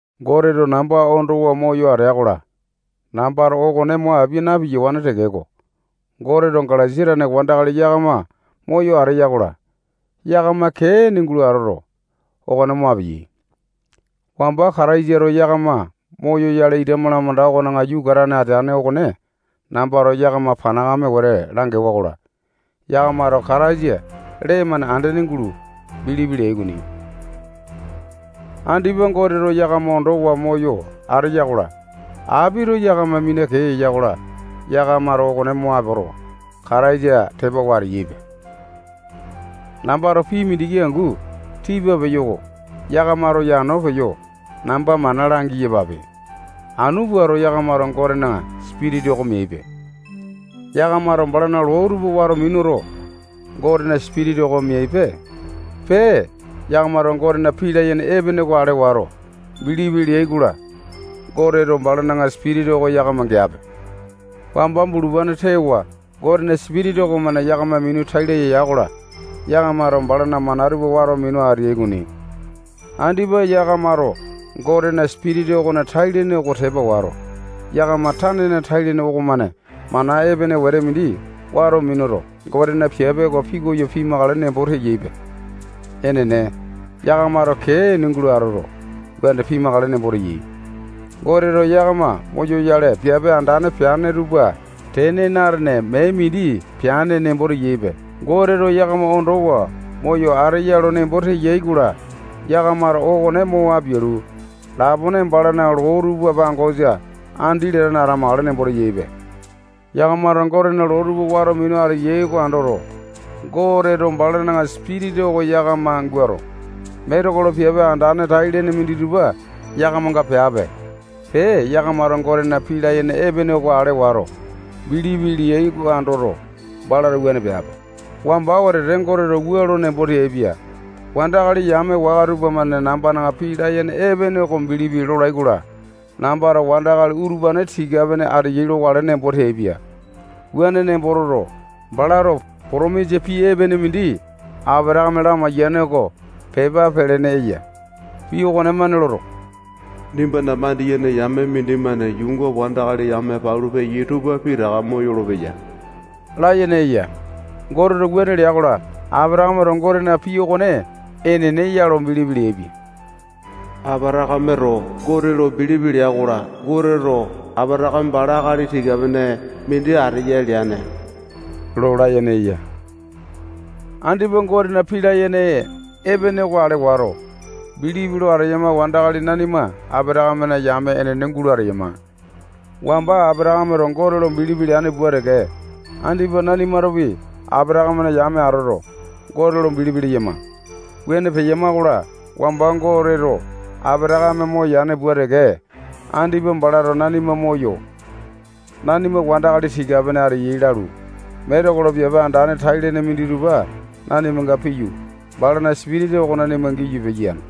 Goteto namba ondowa moyo ateya-kola, nambato okone mo apia na-piyawane tekeko, Goteto Galesia tane wandakali yakama moyo ateya-kola, yakama kee ene gulo atoto, okone mo apeyai. Wamba Kataisato yakama moyoyale ita malamanda okona yukatane ateane okone nambato yakama panakame wete langewa-kola, yakamato Kataisa lee-mane andene gulo bilipi leai okoni. Andipa Goteto yakama ondowa moyo ateya-kola, apito yakama mina kee eya-kola, yakamato okone mo apoto, Kataisa tepawa ateyaipe. Nambato pii mindiki angu tipa peyo oko yakamato yano peyo namba mana langi-yapape. Anu puato, yakamato Gotena Sipitisa oko meaipe. Yakamato balana loo tupa wato minuto, Gotena Sipitisa oko meaipe. Pee, yakamato Gotena pii layene epene oko ale wato, bilipi leai-kola, Goteto balana Sipitisa oko yakama geape. Wamba bulupane tewa Gotena Sipitisa okomane yakama minu tai laya ya-kola, yakamato balana mana tupa wato minu ateai okoni. Andipa yakamato Gotena Sipitisa okona tai-lene oko tepa wato, yakama tanena tai-lene okomane mana epene wete mindi wato minuto, Gotena piape oko pikoyo pimakale nembo teyaipe. Enene, yakamato kee ene gulo atoto, wuane pimakale nembo teyaipe. Goteto yakama moyoyale piape andane peane tupa tene na-atene mee mindi peane nembo teyaipe. Goteto yakama ondowa moyo ateya lo nembo teyai-kola, yakamato okone mo apialu, lapone balana loo tupa pangosa andi latane atamakale nembo teyaipe. Yakamato Gotena loo tupa wato minu ateai oko andoto, Goteto balana Sipitisa oko yakama guato, metekolo piape andane, tai-lene minditupa yakamanga peape. Pee, yakamato Gotena pii layene epene oko ale wato, bilipi leai oko andoto, balato wuane peape. Wamba wetete Goteto wua lo nembo teaipia: Wandakali yame waka tupamane nambana pii layene epene oko bilipi lolai-kola, nambato wandakali utupane tika-pene ateyai lokale nembo teaipia. Wuane nembo toto, balato potomisa pii epene mindi Apatakame lamaiyane oko pepa pelene eya. Pii okonemane loto, nimbana mandiyene yame mindimane yuunga wandakali yame palu peyai tupa pitaka moyolo-peya layene eya. Goteto wuane lea-kola, Apatakameto Gotena pii okone enene ya lo bilipi leaipia. Apatakameto Gote lo bilipi lea-kola, Goteto Apatakame bala akali tika-pene mindi ateya leaipia. Andipa Gotena pii layene epene oko ale wato, bilipi lo ateyama wandakali nanima Apatakamena yame enene gulo ateyama. Wamba Apatakameto Gote lo bilipi leane pua teke, andipa nanimatopi Apatakamena yame atoto, Gote lo bilipi leyama. Wuane peyama-kola, wamba Goteto Apatakame moyane pua teke, andipa balato nanima moyo, nanima wandakali tika-pene ateyai lalu, metekolo piape andane tai-lene minditupa nanimanga piyu, balana Sipitisa oko nanima giyu, piyane.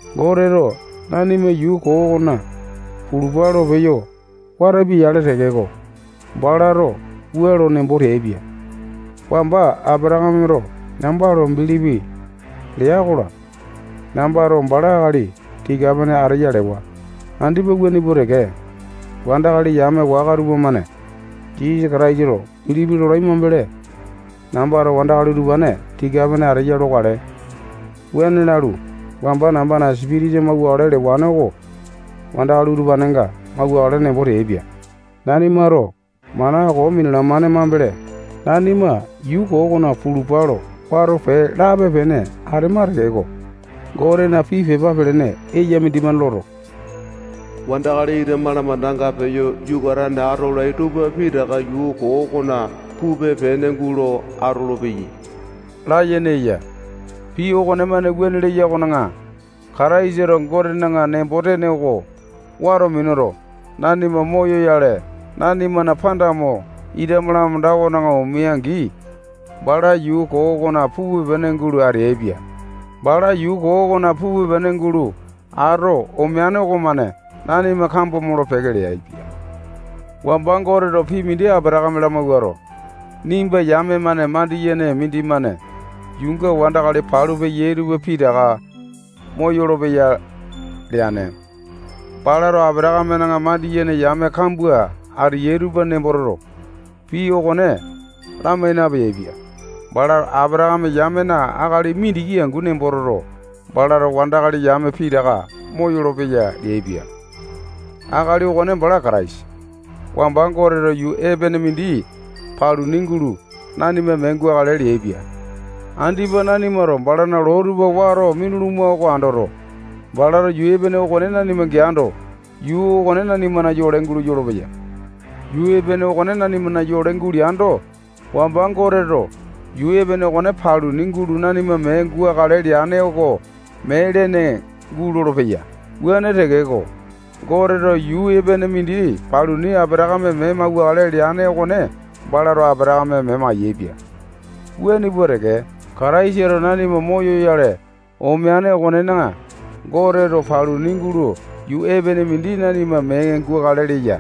Goteto nanima yuu koo okona pulupa lo peyo watapia-yale tekeko, balato wua lo nembo teaipia: Wamba Apatakameto namba lo bilipi lea-kola, nambato bala akali tika-pene ateya lewa. Andipa wuane pua teke, wandakali yame waka tupamane Jisasa Kataisa lo bilipi lolai mambele, nambato wandakali utupane tika-pene ateyai lokale. Wuane lalu, wamba nambana Sipitisa mauwakale lewane oko wandakali utupanenga mauwakale nembo teaipia. Nanimato mana koo minalamane mambele, nanima yuu koo okona pulupa lo wato pee lape-pene atema tekeko, Gotena pii pepa pelene eya mindimane loto, wandakali ita malamandanga peyo yukatane atolai tupa pitaka yuu koo okona pupe-pene gulo atolopeyai layene eya. Pii okonemane wuane leya okona, Kataisato Gotena nembo-tene oko wato minuto, nanima moyoyale, nanimana panda mo, ita malamanda okona omea-angi, bala yuu koo okona pupe-pene gulo ateaipia. Bala yuu koo okona pupe-pene gulo ato omeane okomane nanima kambo molo-peke leaipia. Wamba Goteto pii mindi Apatakame lamawuato, nimba yame-mane mandiyene mindimane yuunga wandakali palu peya tupa pitaka moyolo-peya leane. Balato Apatakamena mandiyene yame kambua ateyai tupa nembo toto, pii okone lamai napeaipia. Balato Apatakame yamena akali mindiki angu nembo toto, balato wandakali yame pitaka moyolo-peya leaipia. Akali okone bala Kataisa. Wamba Goteto yuu epene mindi paluni gulo nanima mee gukale leaipia. Andipa nanimato balana loo tupa wato minuluma oko andoto, balato yuu epene okone nanima geando, yuu okone nanimana yole gulo yolopeya. Yuu epene okone nanimana yole guleando, wamba Goteto yuu epene okone paluni gulo nanima mee gukale leane oko mee lene gulolo-peya. Wuane tekeko, Goteto yuu epene mindi paluni Apatakame mee mauwakale leane okone balato Apatakame mee mayaepia. Wuane pua teke, Kataisato nanima moyoyale omeane okonena, Goteto paluni gulo yuu epene mindi nanima mee gukale leya.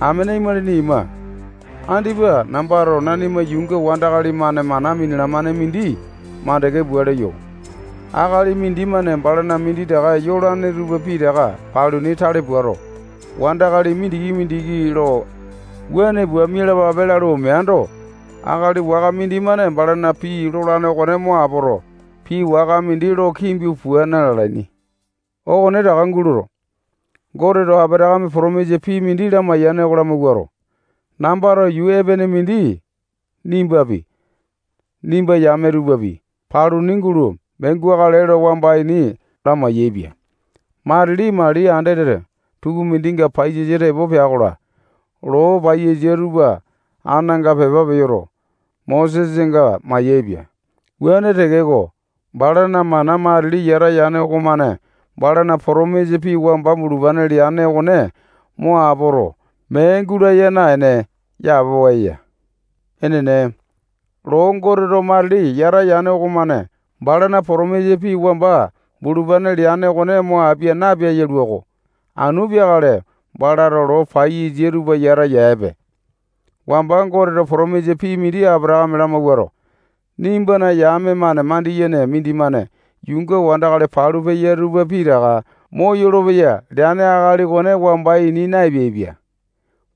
Amene imalini ima, andipa nambato nanima yuunga wandakali-mane mana minalamane mindi mandeke pua leyo. Akali mindimane balana minditaka yolane tupa pitaka paluni tale puato, wandakali mindiki-mindiki lo wua pua mialapape lalu omeando, akali waka mindimane balana pii lolane okone mo apoto, pii waka mindi lo kimbu pua na-lalaini. Okonetaka gulo, Goteto Apatakame potomisa pii mindi lamaiyane oko lamawuato, nambato yuu epene mindi nimbapi, nimbana yame tupapi, paluni gulo mee gukale lo wamba ini lamai-yaepia. Matili mali andete tukumindinga paiyasa tepo pea-kola, loo paiyasa tupa ananga pepa peyoto, Mosenga mayaepia. Wuane tekeko, balana mana matili yata yane okomane balana potomisa pii wamba bulupane leane okone mo apoto, mee gulaya naene, yapowa eya. Enene, loo Goteto matili yata yane okomane balana potomisa pii wamba bulupane leane okone mo apia napeae yalua-ko. Anu peakale balato loo paiyasa tupa yata yaepiape. Wamba Goteto potomisa pii mindi Apatakame lamawuato, nimbana yame-mane mandiyene mindimane yuunga wandakali palu peya tupa pitaka moyolo-peya leane akali okone wamba ini na-epeaipia.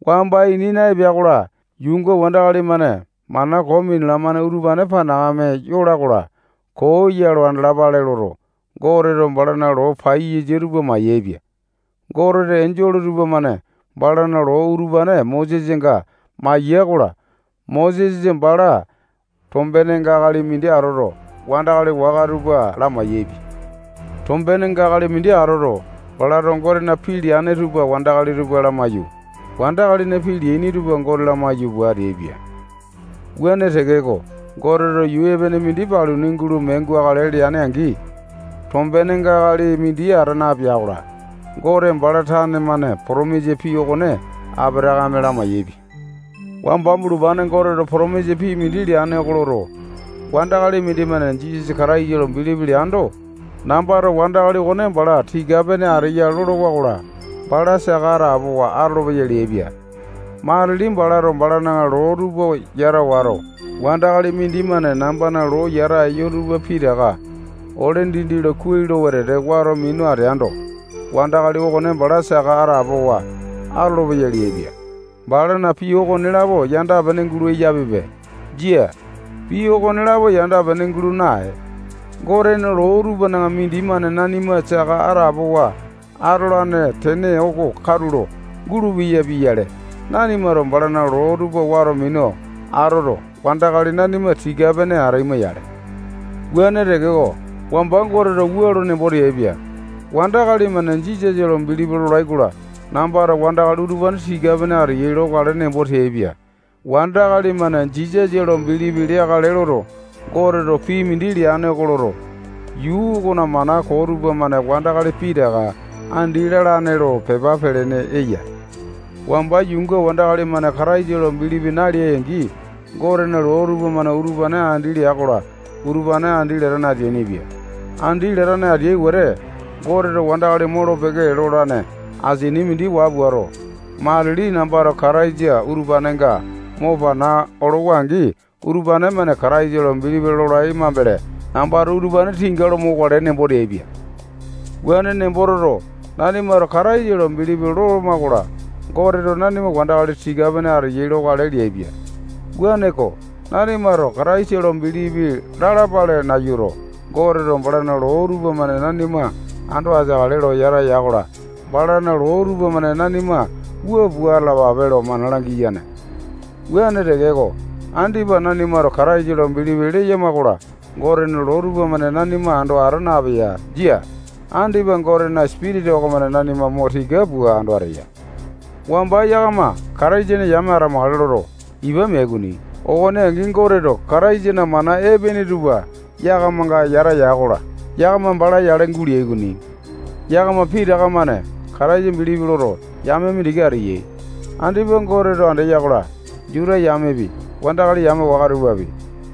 Wamba ini naepea-kola, yuunga wandakali-mane mana koo minalamane utupane panakame yola-kola, koo ya lo andalapale loto, Goteto balana loo paiyasa tupa mayaepia. Goteto enjole tupamane balana loo utupane Mosesanga maiya-kola, Mosesa bala tombenenga akali mindi atoto, wandakali waka tupa lamai-yaepia. Tombenga akali mindi atoto, balato Gotena pii layene tupa wandakali tupa lamaiyu, wandakalina pii leaini tupa Gote lamaiyu pua ateaipia. Wuane tekeko, Goteto yuu epene mindi paluni gulo mee gukale lea-angi, tombenenga akali mindi ata napea-kola, Gote bala tane-mane potomisa pii okone Apatakame lamai-yaepia. Wamba bulupane Goteto potomisa pii mindi leane oko loto, wandakali mindimane Jisasa Kataisa lo bilipi leando, nambato wandakali okone bala tika-pene ateya lolowa-kola, bala saka atapowa atolopeya leaipia. Matili balato balana loo tupa yata wato, wandakali mindimane nambana loo yata eyo tupa pitaka ole dindi lo kuai lo wetete wato minu ateaindo, wandakali okone bala saka atapowa atolopeyai leaipia. Balana pii okonelapo yanda-pene gulo eyapipe. Jia, pii okonelapo yanda-pene gulo nae. Gotena loo utupanena mindimane nanima saka atapowa atolane tene oko katulo gulupeya pia-yale, nanimato balana loo tupa wato minu atoto, wandakali nanima tika-pene ataima-yale. Wuane tekeko, wamba Goteto wua lo nembo teaipia: Wandakali-mane Jisasa lo bilipi lolai-kola, nambato wandakali utupane tika-pene ateyai lokale nembo teaipia. Wandakali-mane Jisasa lo bilipi leakale loto, Goteto pii mindi leane oko loto, yuu okona mana koo tupamane wandakali pitaka andi lalane lo pepa pelene eya. Wamba yuunga wandakali-mane Kataisa lo bilipi naleai-angi, Gotena loo tupamane utupane andi lea-kola, utupane andi latane ateainipia. Andi latane ateai wete, Goteto wandakali molo-peke lolane asini mindi waa puato, matili nambato Kataisa utupanenga mo pana olowa-angi, utupane-mane Kataisa lo bilipi lolai mambele, nambato utupane tinga lo mokale nembo teaipia. Wuane nembo toto, nanimato Kataisa lo bilipi loloma-kola, Goteto nanima wandakali tika-pene ateyai lokale leaipia. Wuaneko, nanimato Kataisa lo bilipi lalapale nayuto, Goteto balana loo tupamane nanima ando ateakale lo yata ya-kola, balana loo tupamane nanima wua pua atalapa lo mana langeai. Wuane tekeko, andipa nanimato Kataisa lo bilipi leyama-kola, Gotena loo tupamane nanima ando ata napeya. Jia. Andipa Gotena Sipitisa okomane nanima mo tika pua ando ateya. Wamba yakama Kataisana yame atamakale loto, ipa meai okoni. Okone angi, Goteto Kataisana mana epene tupa yakamanga yata ya-kola, yakama bala yale guleai. Yakama pitaka-mane Kataisa bilipi loto, yame mindiki ateyai. Andipa Goteto andeya-kola, Juta yamepi, wandakali yame waka tupapi,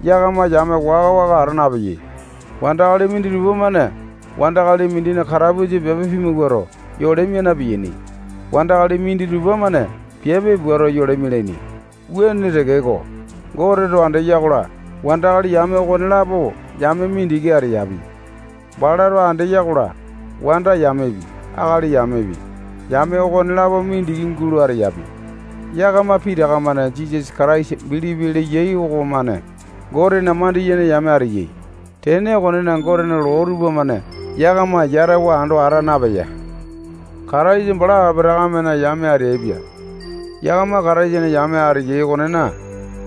yakama yame waka-waka ata napeyai. Wandakali minditupa-mane wandakali mindina katapusa piape pimawuato, yole mia na-piyaini. Wandakali minditupa-mane piape puato, yole mialaini. Wuane tekeko, Goteto andeya-kola, wandakali yame okonelapo yame mindiki ateyapi. Balato andeya-kola, wanda yamepi, akali yamepi, yame okonelapo mindiki gulo ateyapi. Yakama pitaka-mane Jisasa Kataisa bilipi leyai okomane Gotena mandiyene yame ateyai. Tene okonena, Gotena loo tupamane yakama yatawa ando ata napeya. Kataisa bala Apatakamena yame ateaipia. Yakama Kataisana yame ateyai okonena,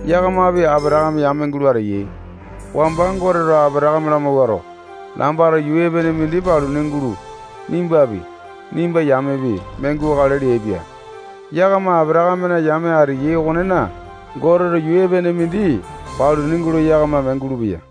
yakamapi Apatakame yame gulo ateyai. Wamba Goteto Apatakame lamawuato, nambato yuu epene mindi paluni gulo, nimbapi, nimba yamepi, mee gukale leaipia. Yakama Apatakamena yame ateyai okonena, Goteto yuu epene mindi paluni gulo yakama mee gulupeya.